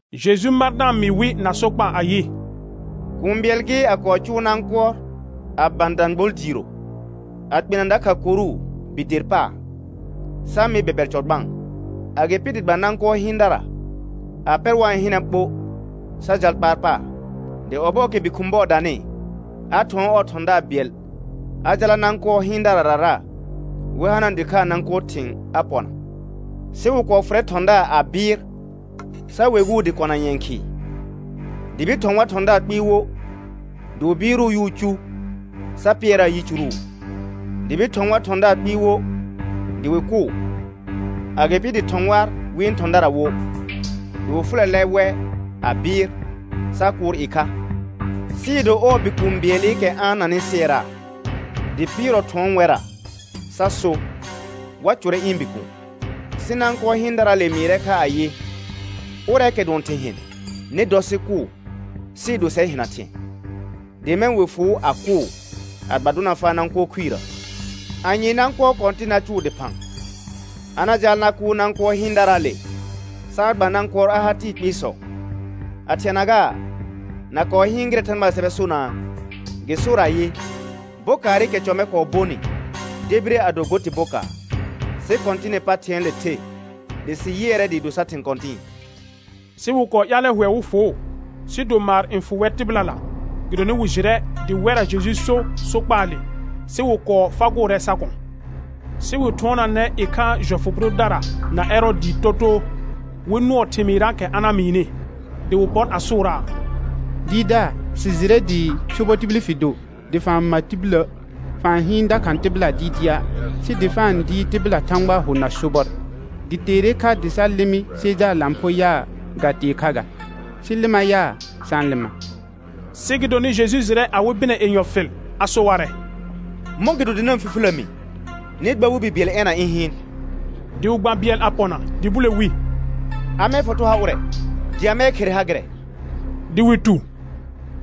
Jeju mar da-n mɩɩ wɩ na sokpaa ayɩ: Kũu bɩɛl gɩ, a kɔɔ cʋʋ nãkʋɔr a bã dãgbol diiro, a kpena dakha koru bi der paar, sa mɩ bɛbɛr cɔ gbãa. Agɩpɩ dɩ gba nãkʋɔr hɩɩndara a pɛr wa-n hɩnɛ ɓo, sa jal kpaar paar. Dɩ ɔbɔɔkɛ bi khʋ̃ bɔɔ danɩ, a thʋɔn ɔɔ thɔ̃daar bɩɛl a jala nãkʋɔr hɩɩndararara, wɩ hanaa dɩkhaa nãkʋɔr thɩ̃ a pɔna. Sɩ wɩ kɔɔ fʋrɛ thɔ̃daar a bɩɩr, sa weguu dɩ kɔna nyɛ̃ khɩɩ. Dɩ bir thɔ̃ war thɔ̃daar kpɩɩ wo, dɩ wɩ bɩɩrʋʋ yʋʋ cu, sa pɩɛraa yicuru. Dɩ bir thɔ̃ war thɔ̃daar kpɩɩ wo, dɩ wɩ kʋʋ. Agɩpɩ dɩ thɔ̃ war wɩ̃ thɔ̃dara wo, dɩ wɩ fʋlɛlɛ wɛ a bɩɩr sa kʋʋr ɩkha. Sɩɩ do ɔɔ bikũu bɩɛlɩkɛ a-n nanɩ sɩɛraa, dɩ pɩɩrɔ thʋ̃ɔ wɛrra sa so wa cʋrɛ ɩ̃ bikuun. Sɩ nãkʋɔr hɩɩndaraale mɩɩrɛ kha ayɩ: Ʋrɛɛkɛ dʋɔn thɩ̃ hɩn, nɩ dɔ sɩ kʋʋ, sɩɩ do sɛr hɩna thɩ̃ɛ. Dɩ mɛ̃ wɩ fʋʋ, a kʋʋ, a gba dʋna faa nãkʋɔr khuirə. Anye nãkʋɔr kɔ̃tɩn na cʋʋ dɩphã? A na jaal na kʋʋr nãkʋɔr hɩɩndaraale, sa a gba nãkʋɔr a ha tɩɩ kpɩɩsɔ. A thɩɛna gaa, na kɔɔ hɩɩn gɩrɛ Thãgbaa sɛbɛ sonaa? Gɩ sor ayɩ: «Bokaarɩkɛ cɔ mɛ kɔɔ bonɩ, debire a do go tɩ bokaar; sɩ Kɔ̃tɩnɩ pa thɩ̃ɛɛle the, dɩ sɩ yɩɛrɛ dɩɩ do sar thɩ̃ kɔ̃tɩ̃ɩ.» Sɩ wɩ kɔɔ ƴaalɛ hʋɛ wɩ fʋʋ, sɩɩ do maar n fʋ wɛr tɩbɩlala, gɩdonɩ wɩ jɩrɛ dɩ wɛrra Jeju so sokpaale, sɩ wɩ kɔɔ fagʋʋrɛ sa kɔ̃. Sɩ wɩ thʋɔnaanɛ ɩkhaa jɔfʋ bʋ dʋdara na Ɛrɔɔdɩɩ totoo, wɩ nʋɔ thɩmɩɩrraakɛ a na mɩɩnɩ. Dɩ wɩ pɔr a sʋʋraa: Dɩɩrdaar, sɩ jɩrɛ dɩ sobɔ tibil fɩ do, dɩ fa-n ma tibilə', fa-n hɩɩn dakha tɩbɩla dɩɩdɩa', sɩ dɩ fa-n dɩɩr tɩbɩla Thãgbaa hʋ na sobɔr. Gɩ teere kha dɩ sa lɩmɩ Sejaar lãpho yaa, ga tee kha ga? Sɩ lɩma yaa, sa-n lɩma? Sɩ gɩdonɩ Jeju jɩrɛ awɩ bɩnɛ yenyɔ fɩl, a so warɛ: Mɔ̃gɩdo dɩ na-n fifilə mi? Nɩ gba war bi bɩɛl ɛna ɩ̃ hɩɩn. Dɩ wɩ gba bɩɛl a pɔna, dɩ bule wi: Amɛɛ foto ha ʋrɛ, dɩ amɛɛ khere ha gɩrɛ? Dɩ wɩ tu: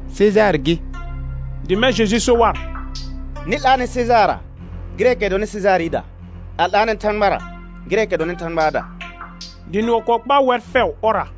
Sejaar gɩ. Dɩ mɛ̃ Jeju so war: Nɩ 'laanɛ Sejaarra gɩrɛɛkɛ dɔnɩ Sejaarɩda, a 'laanɛ Thãgbara gɩrɛɛkɛ dɔnɩ Thãgbaada; dɩ nʋɔ kɔɔ kpaa wɛr fɛʋ ɔrra.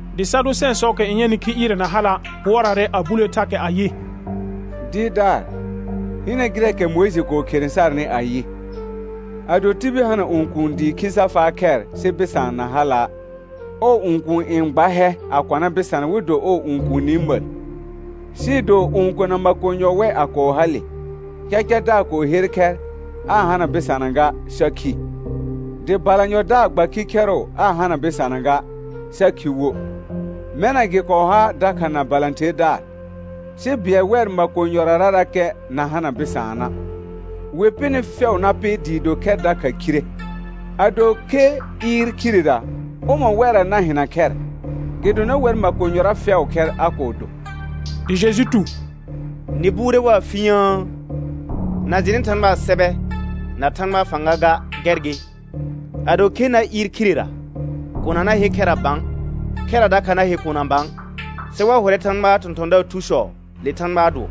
Dɩ Sadʋsɛ̃ɛsɔɔkɛ n yɛnɩ khi ɩɩrɛ na hala', pʋɔraarɛ a bulee thakɛ ayɩ: Dɩɩrdaar, hɩnɛ gɩrɛɛkɛ Mʋɩjɩ kɔɔ khere sarnɩ ayɩ: «Ado tibil hana õkuun dɩ khi sa faa khɛr sɩ bɩsaan na hala', ɔɔ õkuun n gba hɛ a kɔna bɩsana wɩ do ɔɔ õkuuni məl.» Sɩɩ do õkona makonyɔ wɛ a kɔɔ hale; cacadaar kɔɔ her khɛr aa hana bɩsana ga, sa khi. Dɩ balanyɔdaar gba khikhɛrʋ aa hana bɩsana ga, sa khi wo; mɛna gɩ kɔɔ ha dakha na balãtherdaar. Sɩ bɩɛl wɛr makonyɔrarakɛ na hana bɩsaana', wɩ pɩnɩ fɛʋ na pɩ dɩɩ do khɛr dakha khire. Ado khe ɩɩr khirera, ʋmɔ̃ wɛrra na hɩna khɛr? Gɩdonɩ wɛr makonyɔra fɛʋʋ khɛr a kɔɔ do. Dɩ Jeju tu: Nɩ buure waa fu yə̃ə? Na jɩnɩ Thãgbaa sɛbɛ na Thãgbaa fãga ga, gɛr gɩ. Ado khe na ɩɩr khirera, kona na he khɛra bã, khɛra dakha na he kona bã, sɩ wa hʋrɛ Thãgbaa thɔ̃thɔ̃daar thusɔ le Thãgbaa dʋɔ.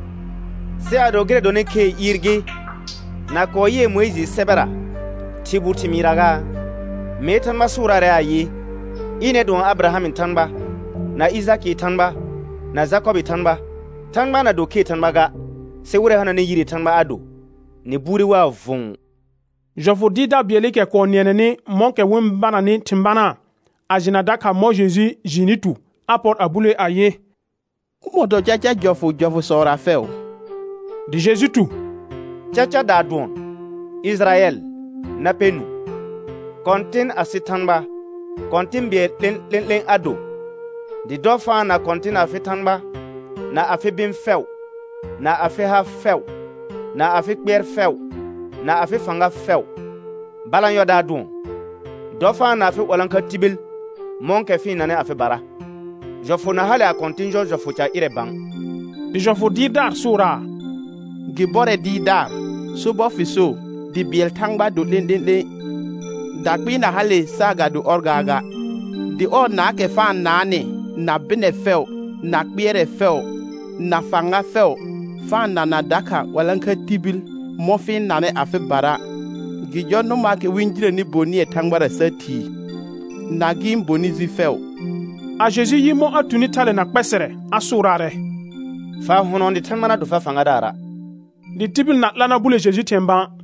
Sɩ ado gɩrɛ dɔnɩ khee ɩɩr gɩ, na kɔɔ yɩɛ Mʋɩjɩɩ sɛbɛra thɩr bu thɩmɩɩrra gaa? Mee Thãgbaa sʋʋraarɛ ayɩ: «Ɩnɛr dʋɔn Abɩrahamɩ Thãgba, na Ɩjakɩɩ Thãgba, na Jakɔbɩɩ Thãgba.» Thãgba na do khee Thãgba ga, sɩ wɩrɛ hananɩ yiree Thãgba a do; nɩ bure waa vʋ̃ʋ. Jɔfʋ dɩɩrdaar bɩɛlɩkɛ kɔɔ nɩɛnɛnɩ mɔ̃kɛ wɩ-n bananɩ thɩ̃ banaa, a jɩna dakha mɔ̃ Jeju jɩɩnɩ tu, a pɔr a bulee ayɩ: Ʋmɔ̃ dɔ caca jɔfʋ jɔfʋsɔra fɛʋ? Dɩ Jeju tu: Gacadaa dʋɔn: «Ɩjɩrayɛl na pɛ nũu, Kɔ̃tɩn asɩ Thãgba, Kɔ̃tɩ̃ bɩɛl 'lẽ'lẽ'lẽ a do, dɩ dɔ fa-n na Kɔ̃tɩn afɩ Thãgba na afɩ bɩ̃ fɛʋ, na afɩ ha fɛʋ, na afɩ kpɩɛr fɛʋ, na afɩ fãga fɛʋ.» Balanyɔdaa dʋɔn: «Dɔ fa-n na afɩ 'walãkha tibil mɔ̃kɛ fɩ-n nanɩ afɩbara.» Jɔfʋ na hale a kɔ̃tɩ̃ jɔ jɔfʋ ca ƴɩrɛ bã. Dɩ jɔfʋ dɩɩrdaar sʋʋraa: Gɩ bɔrɛ Dɩɩrdaar, sobɔr fɩ so, dɩ bɩɛl Thãgba do 'lẽ'lẽ'lẽ, dakpɩɩ na hale saagado ɔr gaaga, dɩ ɔɔ naakɛ fa-n naanɩ na bɩnɛ fɛʋ, na kpɩɛrɛ fɛʋ, na fãga fɛʋ, fa-n nana dakha 'walãkha tibil mɔ̃ fɩ-n nanɩ afɩbara, gɩ jɔr nʋmaakɛ wɩ-n jinəni bonɩɛ Thãgbara sa thii, na gɩ̃ bonɩ ji fɛʋ. A Jeju yɩ mɔ̃ a tuni thale na kpɛsɛrɛ, a sʋʋraarɛ: Fa hʋnɔ dɩ Thãgba na do far fãgadaara'. Dɩ tibil na 'la na bule Jeju thɩ̃ɛ bã.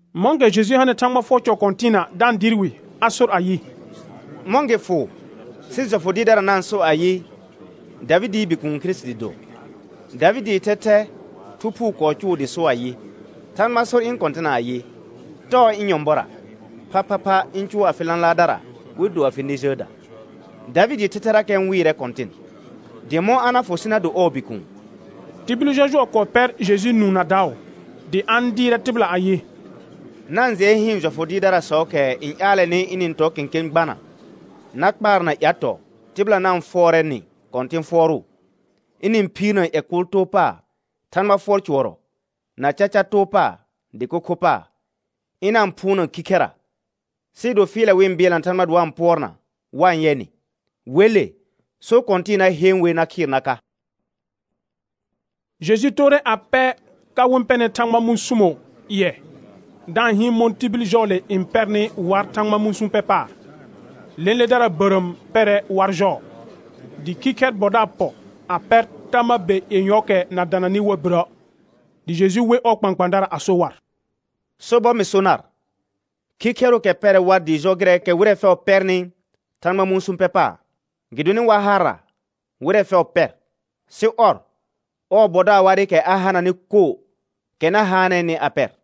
Mɔ̃kɛ Jeju hanɩ Thãgba fʋɔr cɔ kɔ̃tɩɩna da-n dɩɩr wɩ, a sor ayɩ: Mɔ̃ gɩ fʋ sɩ jɔfʋ dɩɩrdarasɔ na-n so ayɩ: Davɩdɩɩ Bikuun Kirisiti do? Davɩdɩɩ thɛthɛ Thu Phuu kɔɔ cʋʋ dɩ so ayɩ: «Thãgba sor ɩ̃ Kɔ̃tɩna ayɩ: Tɔɔ ɩ̃ nyɔ̃bɔra, phaphapha ɩ̃ cʋʋ afɩ lãlaardara wɩ do afɩ nɛ jəəda.» Davɩdɩɩ thɛthɛrakɛ n wɩɩrɛ Kɔ̃tɩn, dɩ mɔ̃ a na fʋ sɩ na do ɔɔ bikuun? Tibil jɔjʋɔ kɔɔ pɛr Jeju nũu na daʋ. Dɩ a-n dɩɩrɛ tɩbɩla ayɩ: Na-n jɩɛ hɩɩn jɔfʋ dɩɩrdarasɔɔkɛ n ƴaalɛnɩ ɩnɩ-n tɔ kẽkẽ gbana na kpaarna ƴatɔɔ tɩbɩla na-n fʋɔrɛ nɩ kɔ̃tɩ̃ fʋɔrʋʋ; ɩnɩ-n phiirna ƴɛ kʋʋl too paar Thãgba fʋɔr cʋɔrɔ, na caca too paar dɩko kho paar; ɩna-n phʋʋna khikhɛra, sɩɩ do fɩɩlɛ wɩ-n bɩɛlna Thãgba dɩ wa-n pʋɔrna wa-n yɛ nɩ; wele, so kɔ̃tɩ̃ɩ na heen wer na khɩɩr na ka. Jeju toore a pɛ ka wɩ-n pɛnɩ Thãgba mũsumo ƴɩɛ, da-n hɩɩn mɔ̃ tibil jɔɔle n pɛrnɩ war Thãgba mũsũ pɛ paar. Lẽledara bərəəm pɛrɛ war jɔɔ. Dɩ khikhɛr bɔdaar pɔ a pɛr tama be yenyɔɔkɛ na dananɩ war birə'. Dɩ Jeju we ɔɔ kpãkpãadara a so war: Sobɔr mɩ so nar, khikhɛrʋʋkɛ pɛrɛ war dɩɩ jɔ gɩrɛɛkɛ wɩrɛ fɛʋ pɛrnɩ Thãgba mũsũ pɛ paar. Gɩdonɩ war harra wɩrɛ fɛʋ pɛr, sɩ ɔr, ɔɔ bɔdaar warɩkɛ a hananɩ koo, kɛ na haanɛɛnɩ a pɛr.